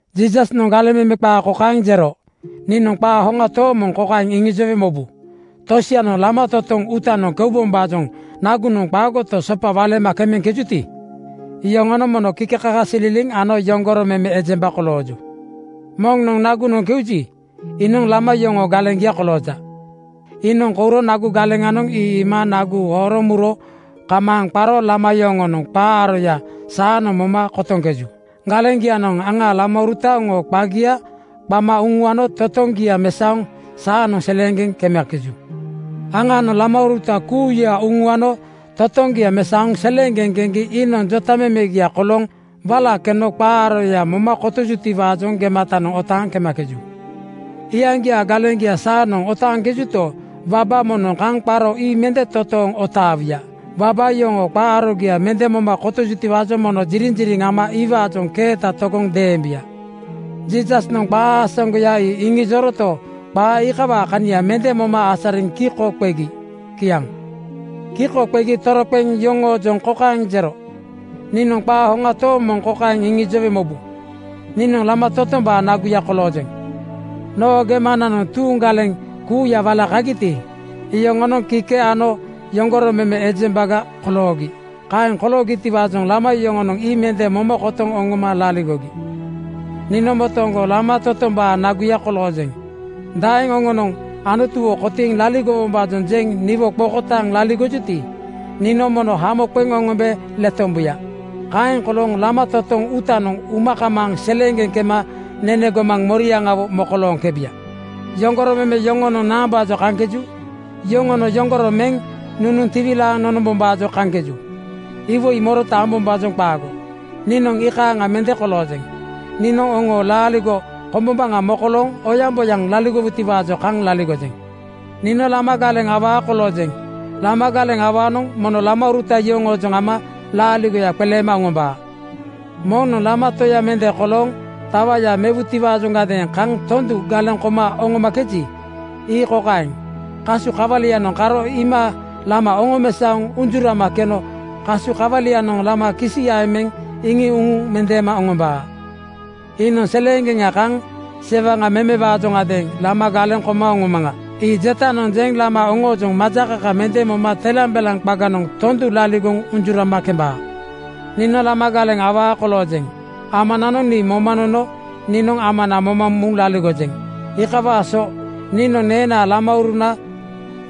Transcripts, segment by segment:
Jiisasnoŋ galeŋ meme qaa kokaeŋ jero, “Niinoŋ qaa hoŋa tooŋ moŋ kokaeŋ iŋijowe mobu: Tosianoŋ lama totoŋ uutanoŋ keubombaajoŋ nagunoŋ qaagoto, sopa waleema kemejuti, yoŋonoŋ mono kikekakasililiŋ ano yoŋgoro meme ejemba kolooju. Moŋnoŋ nagunoŋ keuji, iinoŋ lama yoŋoo galeŋgia kolooja. Iinoŋ kouro nagu galeŋanoŋ ii iima nagu horoŋ muro kamaaŋ qaro lama yoŋonoŋ qaa aroya saanoŋ moma kotoŋkeju. Galeŋgianoŋ aŋaa lamauruta oŋooma qagia qama uŋuano totoŋgia mesaoŋ saanoŋ seleeŋgeŋ kemakeju. “Aŋaanoŋ lamauruta kuuya uŋuano totoŋgia mesaoŋ seleeŋgeŋ keŋgi iinoŋ jotamemegia kolooŋ wala keno qaa aroya moma kotojutiwaajoŋ gematanoŋ otaaŋ kemakeju. Iyaŋgiaa galeŋgia saanoŋ otaaŋkejuto, waba moŋnoŋ kaŋ qaro ii mende totooŋ otaawuya. Waba yoŋoo qaa arogia mende moma kotojutiwaajoŋ mono jiriŋjiriŋ ama iwaajoŋ keeta togoŋ deembuya.” Jiisasnoŋ qaa aasaŋgoya ii iŋijoroto, qaa iikawaa kania mende moma asariŋ kiko qegi. Kiaŋ. Kiko qegi toroqeŋ yoŋoojoŋ kokaeŋ jero, “Niinoŋ qaa hoŋa tooŋ moŋ kokaeŋ iŋijowe mobu: Niinoŋ lama totombaa naguya koloojeŋ. Noo gemananoŋ tuuŋ galeŋ kuuya wala kagiti, iyoŋonoŋ kike ano yoŋgoro meme ejembaga koloogi. Kaeŋ koloogitiwaajoŋ lama yoŋonoŋ ii mende moma kotoŋ oŋoma laligogi. “Niinoŋ motooŋgo lama totombaa naguya koloojeŋ. Daeŋ oŋonoŋ Anutuwo kotiiŋ laligowombaajoŋ jeŋ niwo qokotaaŋ laligojuti, niinoŋ mono hamo qeŋ oŋombe letombuya. Kaeŋ kolooŋ lama totoŋ uutanoŋ uma kamaaŋ seleeŋgeŋ kema nene gomaŋa moriaŋawo mokolooŋkebuya. Yoŋgoro meme yoŋonoŋ naambaajoŋ kaŋkeju? Yoŋonoŋ yoŋgoro meŋ nunuŋ tiwilaaŋ nonombombaajoŋ kaŋkeju. Iwoi morota ambombaajoŋ qaago. Niinoŋ iikaaŋa mende koloojeŋ. Niinoŋ oŋo laaligo kombombaŋa mokolooŋ oyaŋboyaŋ laligowutiwaajoŋ kaŋ laligojeŋ. Niinoŋ lama galeŋ awaa koloojeŋ. Lama galeŋ awaanoŋ mono lamauruta yoŋoojoŋ ama laaligoya qeleema oŋombaa. Moŋnoŋ lama toya mende kolooŋ tawaya mewutiwaajoŋgadeeŋ kaŋ tondu galeŋ koma oŋomakeji, ii kokaeŋ: Kasu kawalianoŋ karo iima lama oŋomesaoŋ unjurama keno kasu kawalianoŋ lama kisiyaeŋ meŋ iŋiŋ uŋuŋ mendeema oŋombaa. Iinoŋ seleeŋgeŋga kaŋ sewaŋ memewaajoŋadeeŋ ‘Lama galeŋ koma oŋomaŋa,’ ii jetanoŋ jeŋ lama oŋoojoŋ majakaka mende moma telambelaŋ qaganoŋ tondu laligoŋ unjurama kembaa. “Niinoŋ lama galeŋ awaa koloojeŋ. Amananoŋ nii moma nono niinoŋ Amana moma muŋ laligojeŋ. Iikawaa so niinoŋ neenaa lamauruna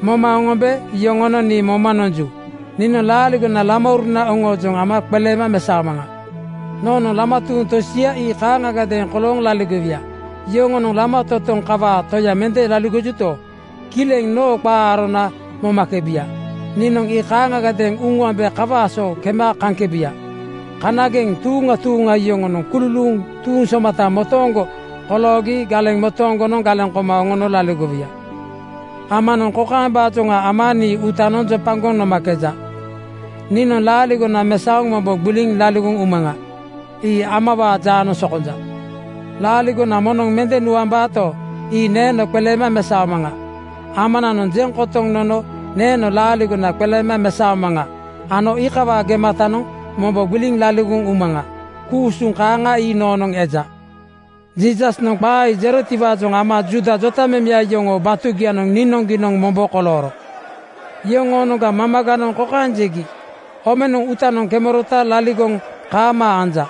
moma oŋombe yoŋonoŋ nii moma nomakeju. Niinoŋ laaligona lamauruna oŋoojoŋ ama qeleema mesaomaŋa. Noonoŋ lama tuuŋ tosia ii kaaŋagadeeŋ kolooŋ laligowuya. Yoŋonoŋ lama totoŋ kokawaa toya mende laligojuto, kileŋ noo qaa arona momakebuya. Niinoŋ ii kaaŋagadeeŋ uŋuambe kawaa so kema kaŋkebuya. Kanageŋ tuuŋa tuuŋa yoŋonoŋ kululuuŋ tuuŋ somata motooŋgo koloogi galeŋ motooŋgonoŋ galeŋ koma oŋono laligowuya. Amanoŋ kokaembaajoŋa ama nii uutanoŋ jopagoŋ nomakeja: Niinoŋ laaligona mesaoŋ mombo gbiliŋ laligoŋ umaŋa. Ii Amawaa jaanoŋ sokonja. Laaligona moŋnoŋ mende nuambaato, ii neeno qeleema mesaomaŋa. Amananoŋ jeŋ kotoŋ nono neeno laaligona qeleema mesaomaŋa ano iikawaa gematanoŋ mombo gbiliŋ laligoŋ umaŋa. Ku-usuŋ kaaŋa ii noonoŋ eja.” Jiisasnoŋ qaa ii jerotiwaajoŋ ama Juuda jotamemeya yoŋoo batugianoŋ niinoŋgiinoŋ mombo kolooro. Yoŋoonoŋga mamaganoŋ kokaeŋ jegi, “Omenoŋ uutanoŋ kemerota laligoŋ kaamaa anja.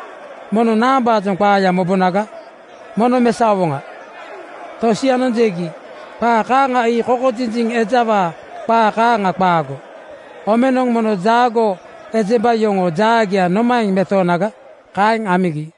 Mono naambaajoŋ qaaya mobonaga? Mono mesaowoŋa.” Tosianoŋ jegi, “Qaa kaaŋa ii kokojinjiŋ ejawaa qaa kaaŋa qaago. Omenoŋ mono jaagoo ejemba yoŋoo jaagia nomaeŋ metoonaga?” Kaeŋ amigi.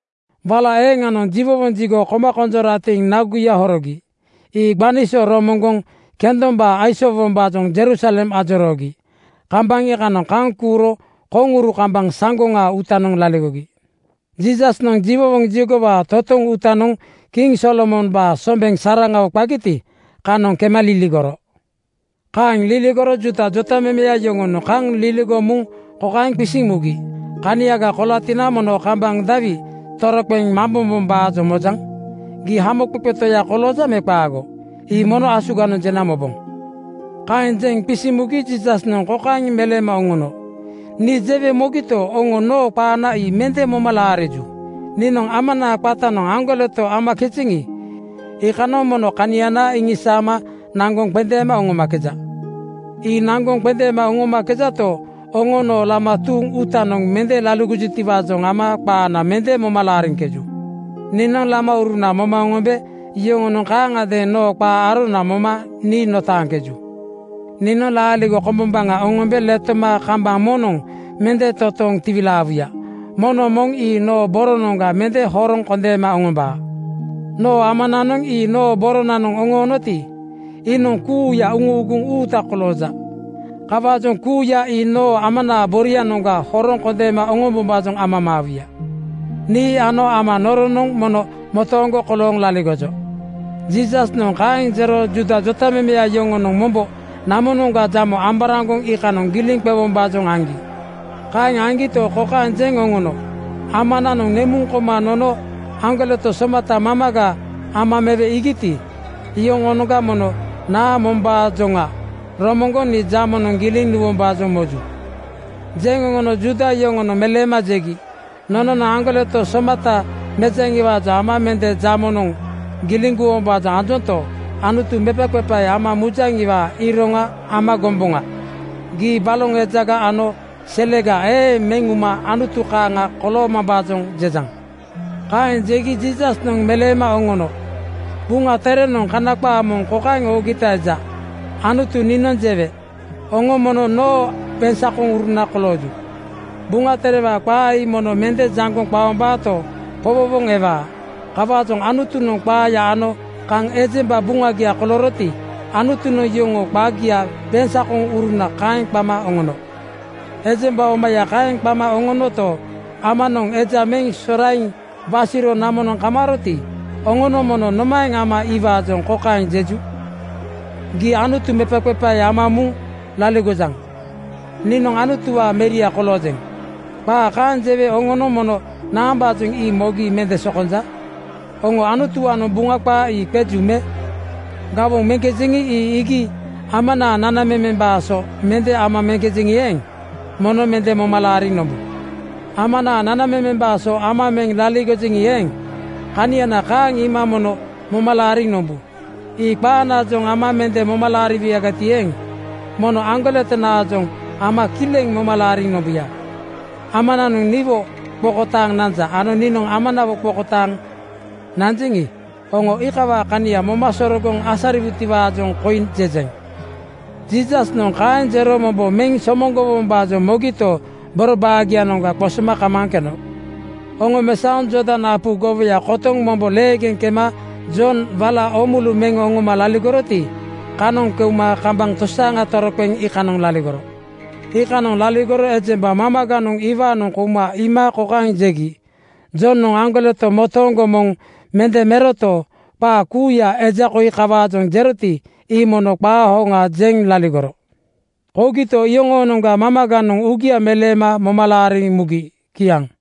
Wala eeŋanoŋ jiwowoŋ jigo koma konjoratiŋ naguya horogi. Ii gbani so romoŋgoŋ kendombaa aisoowombaajoŋ Jerusalem ajoroogi. Kambaŋ iikanoŋ kaŋ kuuro koŋuru kambaŋ saŋgoŋaa uutanoŋ laligogi. Jiisasnoŋ jiwowoŋ jigowaa totoŋ uutanoŋ kiŋ Solomombaa sombeŋ saraŋawo qagiti, kanoŋ kema liligoro. Kema liligoro Juuda jotamemeya yoŋonoŋ kaŋ liligoŋ muŋ kokaeŋ qisiŋ mugi, “Kaniaga kolatina mono kambaŋ dawi toroqeŋ mambombom-baajoŋ mojaŋ? Gii Hamoqeqe Toya koloojaŋ me qaago, ii mono asuganoŋ jena moboŋ.” Kaeŋ jeŋ qisiŋ mugi Jiisasnoŋ kokaeŋ meleema oŋono, “Nii jewe mogito, oŋo noo qaana ii mende moma laariju. Niinoŋ Amanaa qatanoŋ aŋgoleto amakejeŋi, iikanoŋ mono kaniana iŋisaama naŋgoŋ qendeema oŋomakeja. Ii naŋgoŋ qendeema oŋomakejato, oŋo noo lama tuuŋ uutanoŋ mende laligojutiwaajoŋ ama qaana mende moma laariŋkeju. “Niinoŋ lamauruna moma oŋombe yoŋonoŋ kaaŋagadeeŋ noo qaa arona moma nii notaaŋkeju. Niinoŋ laaligo kombombaŋa oŋombe letoma kambaŋ moŋnoŋ mende totooŋ tiwilaawuya. Moŋnoŋ moŋ ii noo boronanoŋga mende horoŋ kondeema oŋombaa. Noo Amananoŋ ii noo boronanoŋ oŋoonoti, iinoŋ kuuya uŋuuguŋ uuta kolooja. Kawaajoŋ kuuyanoŋ ii noo Amanaa borianoŋga horoŋ kondeema oŋombombaajoŋ amamaawuya. Nii ano Ama noronoŋ mono motooŋgo kolooŋ laligojo.” Jiisasnoŋ kaeŋ jero Juuda jotamemeya yoŋonoŋ mombo namonoŋga jamo amboraŋgoŋ iikanoŋ giliŋ qewombaajoŋ aŋgi. Kaeŋ aŋgito, kokaeŋ jeŋ oŋono, “Amanoŋ nemuŋ koma nono aŋgoleto somata mamaga ama mewe iigiti, iyoŋoonoŋga mono naa mombaajoŋa romoŋgoŋ nii jamonoŋ giliŋ nuwombaajoŋ moju?” Jeŋ oŋono Juuda yoŋonoŋ meleema jegi, “Nononoŋ aŋgoleto somata anatiwaajoŋ ama mende jamonoŋ giliŋ guwombaajoŋ anjonto, Anutu mepaqepae ama mujaŋiwaa iroŋa ama gomboŋa. Gii baloŋ ejaga ano selega eeŋ meŋ uma Anutu kaaŋa koloomambaajoŋ jejaŋ.” Kaeŋ jegi Jiisasnoŋ meleema oŋono, “Buŋa Terenoŋ Kana qaa moŋ kokaeŋ oogita eja, ‘Anutu niinoŋ jewe: Oŋo mono noo beŋsakoŋuruna kolooju.’ Buŋa Terewaa qaa ii mono mende jaŋgoŋ qaombaato, powowoŋ ewaa. Kawaajoŋ Anutunoŋ qaaya ano kaŋ ejemba buŋagiaga kolooroti, Anutunoŋ yoŋoo qagia ‘beŋsakoŋuruna’ kaeŋ qama oŋono. Ejemba omaya kaeŋ qama oŋonoto, Amanoŋ eja meŋ soraiŋ wasiro namonoŋ kamaaroti, oŋonoŋ mono nomaeŋ ama iwaajoŋ kokaeŋ jeju, ‘Gii Anutu mepaqepae ama muŋ laligojaŋ.’ Niinoŋ ‘Anutuwaa meria koloojeŋ,’ qaa kaeŋ jewe oŋonoŋ mono naambaajoŋ ii mogi mende sokonja? Oŋo Anutuwaanoŋ Buŋa qaa ii qeju me? “Gawoŋ meŋkejeŋi, ii iigi Amanaa nanamemembaa so mende amakeji eeŋ, mono mende moma laariŋ nombu. Amanaa nanamemembaa so ama meŋ laligojeŋi eeŋ, kaniana kaaŋ iima mono moma laariŋ nombu. Ii qaanaajoŋ ama mende moma laariwuyagati eeŋ, mono aŋgoletonaajoŋ ama kileŋ moma laariŋ nombuya. Amanoŋ niwo qokotaaŋ nanja ano niinoŋ Amawo qokotaaŋ nanjeŋi, oŋo iikawaa kania moma sorogoŋ asariwuti-waajoŋ koi jejeŋ.” Jiisasnoŋ kaeŋ jero mombo meŋ somoŋgowombaajoŋ mogito, boro baagianoŋga qosoma kamaaŋ keno. Oŋomesaoŋ Jordan apu gowoya kotoŋ mombo leegeŋ kema Jonoŋ wala oomulu meŋ oŋoma laligoroti, kanoŋ keuma kambaŋ tosaaŋa toroqeŋ iikanoŋ laligoro. Iikanoŋ laligoro ejemba mamaganoŋ iwaanoŋ kouma iima kokaeŋ jegi, “Jonoŋ aŋgoleto motooŋgo moŋ mende meroto, qaa kuuya eja koi kawaajoŋ jeroti, ii mono qaa hoŋa jeŋ laligoro.” Kougiti, iyoŋoonoŋga mamaganoŋ uugia meleema moma laariŋ mugi. Kiaŋ.